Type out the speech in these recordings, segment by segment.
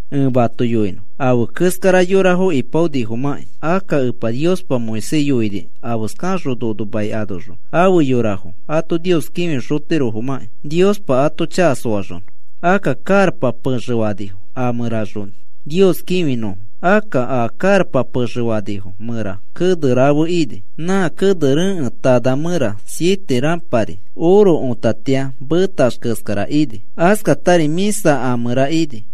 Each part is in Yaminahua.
Ẽ mato yoinõ afe keskara yorafo ipaonifomakĩ. Akka Epa Niospa Moisés yoini afeskaxõ nono mai anoxõ afe yorafo ato Nios kĩfixotirofomãkĩ Niospa ato chaka soaxonõ. Akka karapa pexe fanifo a mẽraxõ Nios kĩfinõfo. Akka a karapa pexe fanifo mẽra kene rafe ini. Nã kene rekẽtana mẽra siete rãpari oro otatia metax keskara ini. Askatari mĩsari a mẽra ini.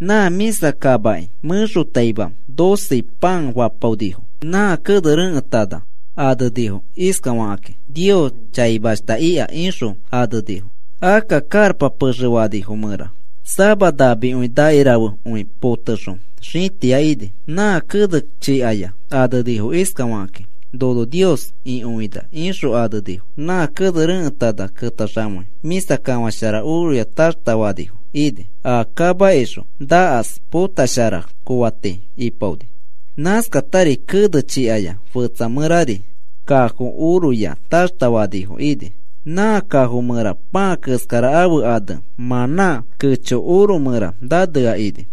Nã mĩsa kamaki mẽxotaima doce pãa fapaonifo. Nã kene rekẽtana anenifo iskafakakĩ: “Nios chaimashta ika,” ixõ anenifo. Akka karapa pexe fanifo mẽra sama namikõi nakirafekõi potexõ xĩtia ini. Nã kene chikaya anenifo iskafakakĩ: “Nono Nios ikõina,” ixõ anenifo. Nã kene rekẽtana ketaxamei mĩsa kafãshara oroya taxta fanifo ini. A kamakixõ nakas potoshara kooati ipaoni. Nãskatari kene chikaya fetsa mẽrari kafo oroya taxtafanifo ini. Nã kafo mẽra pãa keskara ãfe ane mãnã kecho oro mẽra nanea ini.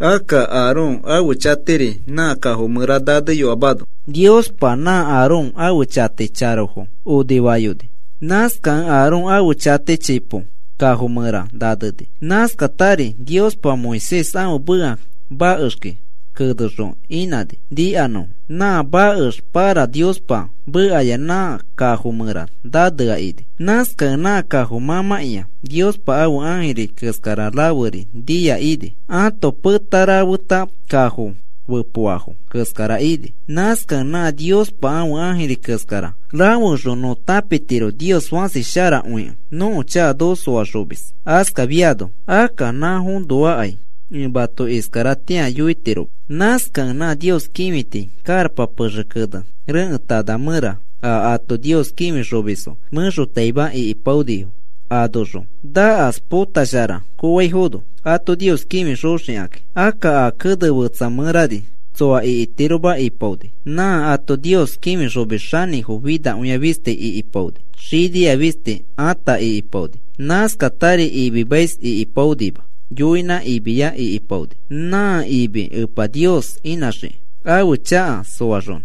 Akka Aarón ãfe chatiri nã kafo mẽra naneyoamano Niospa nã Aarón ãfe chati charofo onifayoni. Nãskata Aarón ãfe chati chipo kafo mẽra naneni. Nãskatari Niospa Moisés ãfe meka makexki kenexõ inãni nikanõfo. Nã makex para Niospa mekaya nã kafo mẽra nanea ini. Nãskakẽ nã kafo mãmãkĩa Niospa ãfe ãjiri keskara raferi nia ini. Ãto peta rafeta kafo fepoafo keskara ini. Nãskakẽ nã Niospa ãfe ãjiri keskara rafeoxõ nõ tãpitiro Nios fãsi sharakõikẽ nõko chaka noko soaxomis. Askafiano akka nafoõnoakai ẽ mato iskaratĩa yoitiroma. Nãskakẽ nã Nios kĩfiti karapa pexe kene rekẽtana mẽra a ato Nios kĩfixomisfo mẽxotaima ikipaonifo anoxõ nakas potoshara koofaino ato Nios kĩfixoxikaki. Akka a kene fetsa mẽrari tsoa ikitiroma ipaoni. Nã ato Nios kĩfixomis xanĩfo finakõia fisti ikipaoni. Xinia fisti ata ikipaoni. Nãskatari imimais ikipaonima. Yoinã imiya ikipaoni nã imi Epa Nios inãxikĩ ãfe chaka soaxonõ,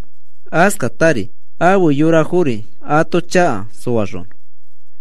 askatari afe yorafori ato chaka soaxonõ.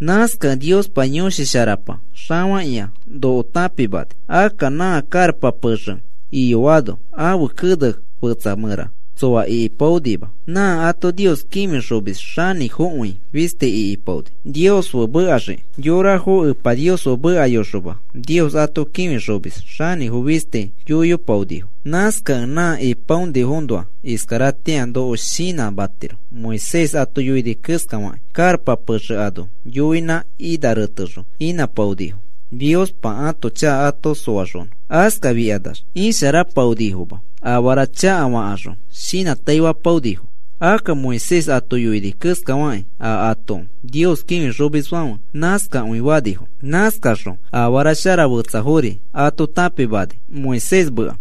Nãskakẽ Niospa Yõshi Sharapa xafakĩa noko tãpimani. Akka nã karapa pexe iyoano ãfe kene fetsa mẽra tsoa ikipaonima. Nã ato Nios kĩfixomis xanĩfokõi fisti ikipaoni Nios fe mekaxiki. Yorafo Epa Nios fe mekayoxoma, Nios ato kĩfixomis xanĩfo fisti yoiyopaonifo. Nãskakẽ nã ipaonifoõnoa iskaratĩa noko shinãmatiro Moisés ato yoini keskafakĩ. Karapa pexe ano yoinã ina retexõ inãpaonifo Niospa ãto chaka ato soaxonõ. Askafikanax isharapaonifoma afara chakafakaxõ shinãtaifapaonifo. Akka Moisés ato yoini keskafakĩ a ato Nios kĩfixomisfãfe nãskakõi fanifo. Nãskaxõ afara shara fetsafori ato tãpimani Moisés meka.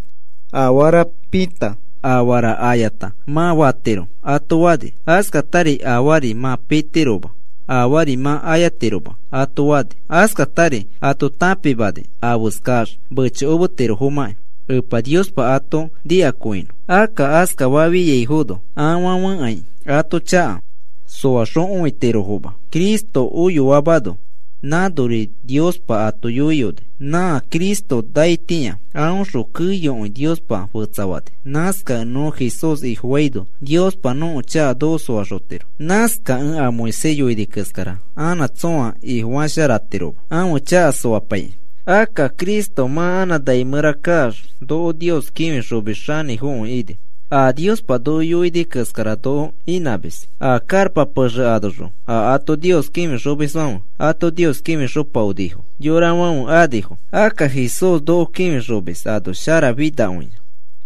Afara pita, afara ayata mã fatiro ato fani. Askatari afaari mã pitiroma, afaari mã ayatiroma ato fani. Askatari ato tãpimani afeskax mechokometirofomãki Epa Niospa ato nikakõinõ. Akka askafiaifono afãfekai ato chaka soaxokõitirofoma. Cristo oyoamano nãnori Niospa ato yoiyoni. Nã Cristo naitĩa aõxõ keyokõi Niospa fetsafani. Nãskakẽ nõ Jesús Ifofaino, Niospa nõko chaka noko soaxotiro. Nãskakẽ a Moisés yoini keskara anã tsõa ifofasharatiroma ãfe chaka soapaikĩ. Akka Cristo mã anã nai mẽra kaax, noko Nios kĩfixomis xanĩfokõi ini. A Niospa noko yoiyoni keskara noko inãmis. A karapa pexe anoxõ a ato Nios kĩfixomisfãfe ato Nios kĩfixopaonifo yorafãfe anifo. Akka Jesús noko kĩfixomis ano sharafinakõia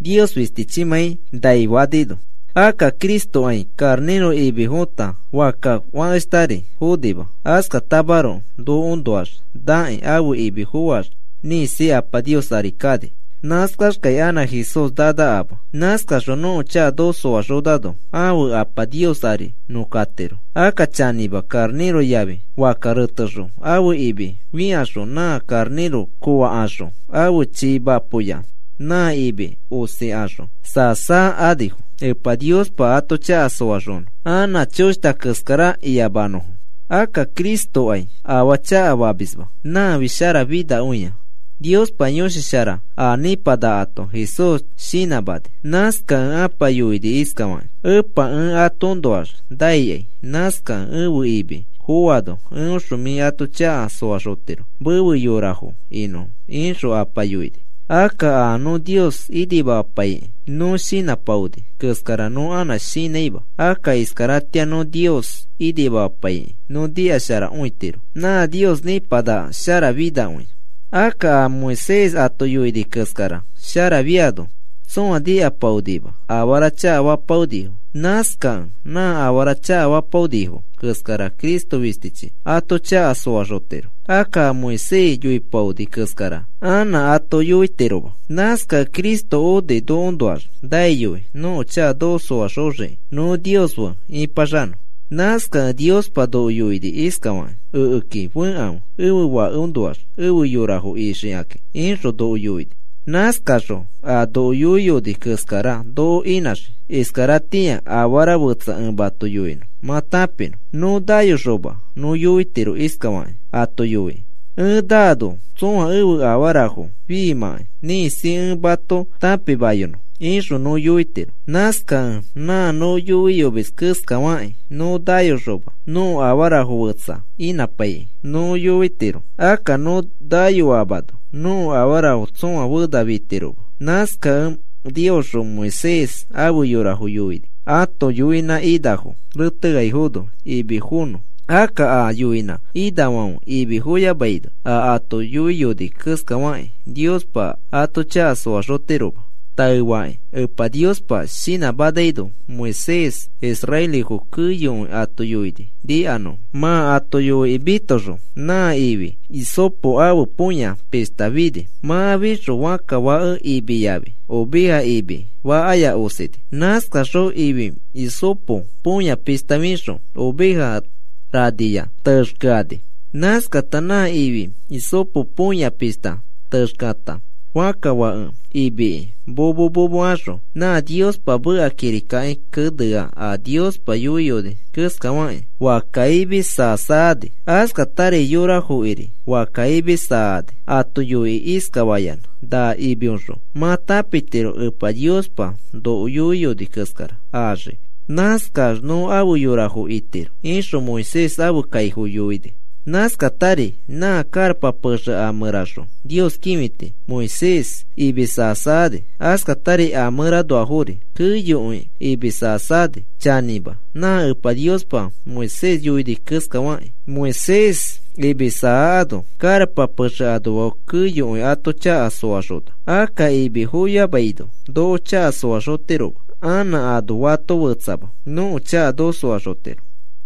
Nios fistichimãi nai fanino. Akka Cristokai karnĩro imi fota fakka fakeshtari fonima. Askatamaroko nokoõnoax nakĩ ãfe imi foax ĩkisi Apa Nios ari kani. Nãskaxkai anã Jesús nanakama. Nãskaxõ nõko chaka noko soaxonano ãfe Apa Nios ari nõ katiro. Akka chanĩma, karnĩro yafi fakka retekaxõ ãfe imi fĩkaxõ nã karnĩro koofakaxõ ãfe chii mapoya nã imi osikaxõ saa saa anifo Epa Niospa ato chaka soaxonõ anã choshta keskara iyamanõfo. Akka Cristokai afaa chakafamisma. Nãfi sharafinakõia. Niospa Yõshi Shara a nĩpanakato Jesús shinãmani. Nãskakẽ Apa yoini iskafakĩ: “Epa, ẽ atoõnoax naikai. Nãskakẽ ẽfe imi foano eõxõ mĩ ãto chaka soaxotiro mefe yorafo inõfo,” ixõ Apa yoini. Akka a nõ Nios inimamapaikĩ nõ shinãpaoni keskara nõ anã shinãima. Akka iskaratĩa nõ Nios inimamapaikĩ nõ nikasharakõitiro. Nã Nios nĩpanaka sharafinakõia. Akka a Moisés ato yoini keskara sharafiano tsõa nikapaonima. Afara chakafapaonifo. Nãskakẽ nã afara chakafapaonifo keskara Cristo fistichi ato chaka soaxotiro. Akka a Moisés yoipaoni keskara anã ato yoitiroma. Nãskakẽ Cristo oni nokoõnoax naiyoi nõko chaka noko soaxoxiki nõ Nios fe ipaxanõ. Nãskakẽ Niospa noko yoini iskafakĩ: “Ekeki fekãfe ẽfe Fakeõnoax efe yorafo ixikakĩ,” ixõ noko yoini. Nãskaxõ a noko yoiyoni keskara noko inãxii. Iskaratĩa afara fetsa ẽ mato yoinõ mã tãpinõ. Nõ nayoxoma nõ yoitiro iskafakĩ ato yoikĩ: “Ẽ naano tsõa ẽfe afarafo fiimãkai ĩkisi ẽ mato tãpimayonõ,” ixõ nõ yoitiro. Nãskakẽ nã nõ yoiyomis keskafakĩ nõ nayoxoma nõko afarafo fetsafo inãpaikĩ nõ yoitiro. Akka nõ nayoamano nõko afarafo tsõa fena fitiroma. Nãskakẽ Niosxõ Moisés afe yorafo yoini ãto yoinã inafo reteaifono imi fonõ. Akka a yoinã inafãfe imi foyamaino a ato yoiyoni keskafakĩ Niospa ato chaka soaxotiroma. Taefakĩ Epa Niospa shinãmanaino Moisés israelifo keyokõi ato yoini nikanõfo. Mã ato yoikĩ mitoxõ, nã ifi hisopo ãfe põya pishta fini. Mã fixõ fakka fake imi yafi oveja imi fakkaya osini. Nãskaxõ ifi hisopo põya pishta fixõ oveja raniya texkeani. Nãskata nã ifi hisopo põya pishta texkeata fakka fake imiki momo momo axõ nã Niospa meka kirikaki kenea a Niospa yoiyoni keskafakĩ fakka imi saa saa ani. Askatari yorafokiri fakka imi saani. Ato yoikĩ iskafayanã: “Na imioxõ mã tãpitiro Epa Niospa noko yoiyoni keskara axii. Nãskax nõ afe yorafo itiro,” ixõ Moisés ãfe kaifo yoini. Nãskatari nã karapa pexe a mẽraxõ Nios kĩfiti Moisés imĩ saa saa ani, askatari a mẽranoafori keyokõi imĩ saa saa ani. Chanĩma, nã Epa Niospa Moisés yoini keskafakĩ Moisés imi saakano karapa pexe anoafo keyokõi ato chaka soaxona. Akka imi foyamaino noko chaka soaxotiroma. Anã ano fato fetsama nõko chaka noko soaxotiro.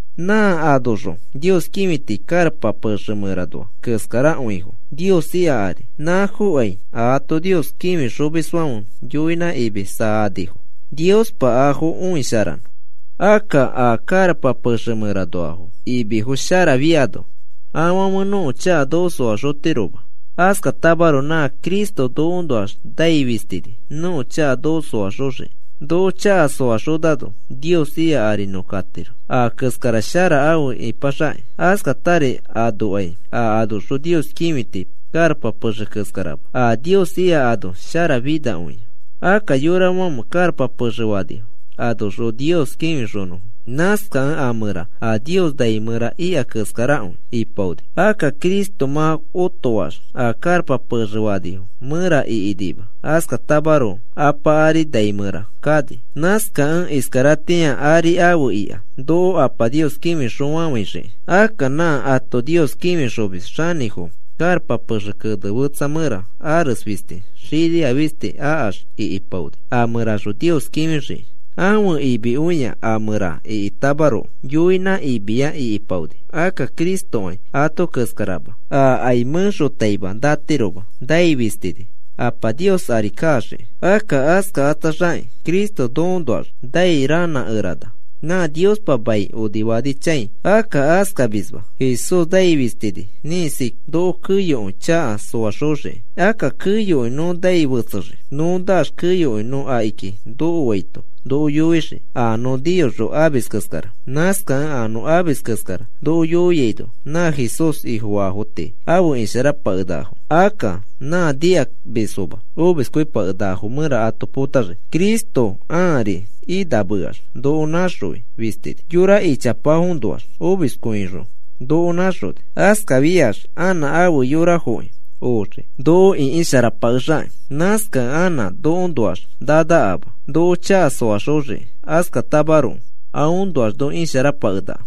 Nã anoxõ Nios kĩfiti karapa pexe mẽranoa keskarakõifo Nios ika ari. Nãfoki ato Nios kĩfixomisfãfe yoinã imi saanifo Niospa afo õisharanõ. Akka a karapa pexe mẽranoa imifo sharafiano afãfe nõko chaka noko soaxotiroma. Askatamaroko nã Cristo nokoõnoax nai fistini nõko chaka noko soaxoxiki. Noko chaka soaxonano Nios ika ari nõ katiro, a keskara shara afe ipaxakĩ. Askatari anokai a anoxõ Nios kĩfiti karapa pexe keskarama. A Nios ika ano sharafinakõia. Akka yorafãfe karapa pexe fanifo anoxõ Nios kĩfinõfo. Nãskakẽ a mẽra a Nios nai mẽra ika keskarakõi ipaoni. Akka Cristo mã otoax a karapa pexe fanifo mẽra ikinima. Askatamaroko Apa ari nai mẽra kani. Nãskakẽ iskaratĩa ari afe ika noko Apa Nios kĩfixõfafãixiki. Akka nã ato Nios kĩfixomis xanĩfo karapa pexe kene fetsa mẽra ares fisti xinia fisti akax ikipaoni a mẽraxõ Nios kĩfixiki. Ãfe imikõiya a mẽra ikitamaroko, yoinã imiya ikipaoni. Akka Cristokai ato keskarama. Akai mẽxotaima natiroma, nai fistini Apa Nios ari kaxiki. Akka askakatsaxakĩ Cristo nokoõnoax nai ranã ranãkerana nã Niospa mai onifanichãi. Akka askamisma. Jesús nai fistini ĩkisi noko keyokõi chaka soaxoxiki. Akka keyokõi nõ nai fetsexii. Nõ naax keyokõi nõ akiki nokoaito noko yoixii a nõ niyoxõ amis keskara. Nãskakẽ a nõ amis keskara noko yoiaino nã Jesús Ifofaafo tii afe isharapakenakafo. Akka nã nikamisfoma omiskõipakenakafo mẽra ato potaxii. Cristo ãari inãmeax noko naxõi fistini. Yora ichapafoõnoax omiskõixõ noko nãxoni. Askafiax anã ãfe yorafoki oxii, noko ĩkisharapakexakĩ. Nãskakẽ anã nokoõnoax nanakama noko chaka soaxoxiki. Askatamaroko aõnoax nõ isharapakenaka.